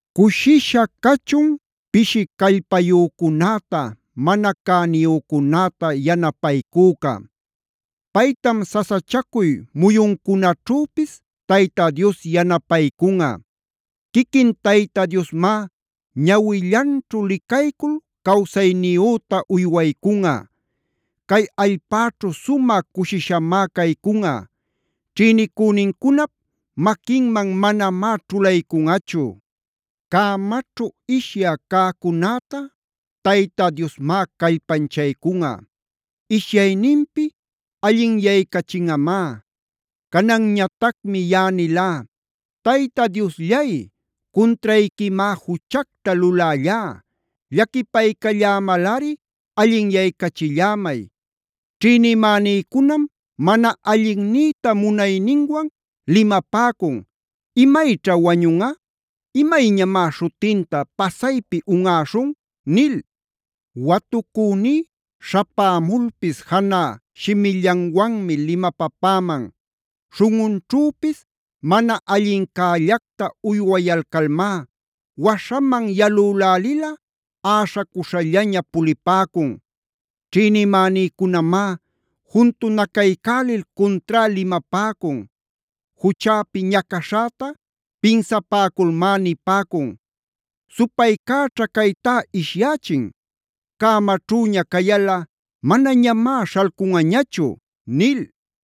Cushisha cachun pishi callpayücunäta, mana cäniyücunäta yanapaycüca.a Paytam sasachacuy muyuncunaćhüpis Tayta Dios yanapaycunꞌa. Quiquin Tayta Diosmá ñawillanćhu licaycul cawsayniyüta uywaycunꞌa. Cay allpäćhu sumä cushishamá caycunꞌa. Ćhïnicünincunap maquinman manamá ćhulaycunꞌachu. Cämaćhu ishyä cäcunäta Tayta Diosmá callpanchaycunꞌa. Ishyayninpi allinyaycachinꞌamá. Cananñatacmi yaꞌa nilá: “Tayta Diosllay, cuntrayquimá juchacta lulällá. Llaquipaycallämalꞌari allinyaycachillämay. Ćhïnimänïcunam mana allinnïta munayninwan limapäcun: ‘¿Imayćha wañunꞌa? ¿Imayñamá śhutinta pasaypi unꞌäśhun?’ nil. Watucüní śhapämulpis janä shimillanwanmi limapapäman. Śhunꞌunćhüpis mana allincällacta uywayalcalmá waśhaman yalülälilꞌa äśhacuśhallaña pulipäcun. “Ćhïnimänïcunamá juntunacaycälil cuntrá limapäcun. Juchäpi ñacaśhäta pinsapäculmá nipäcun: ‘Supaycäćha caytá ishyächin; cämaćhüña cayalꞌa manañamá śhalcunꞌañachu’ nil.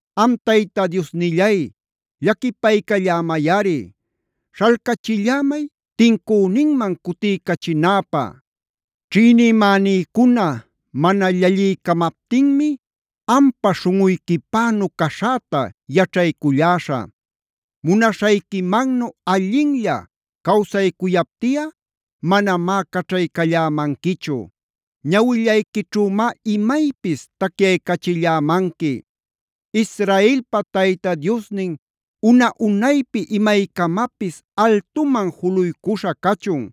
Am Tayta Diosnillay llaquipaycallämayꞌari. Śhalcachillämay tincüninman cutiycachinäpä. “Ćhïnimänïcuna mana llalliycamaptinmi ampa śhunꞌuyquipänu caśhäta yaćhayculläśhä. Munaśhayquimannu allinlla cawsaycuyaptiꞌa manamá caćhaycallämanquichu; ñawillayquićhümá imaypis tacyaycachillämanqui. “Israelpa Tayta Diosnin una-unaypi imaycamapis altuman juluycuśha cachun.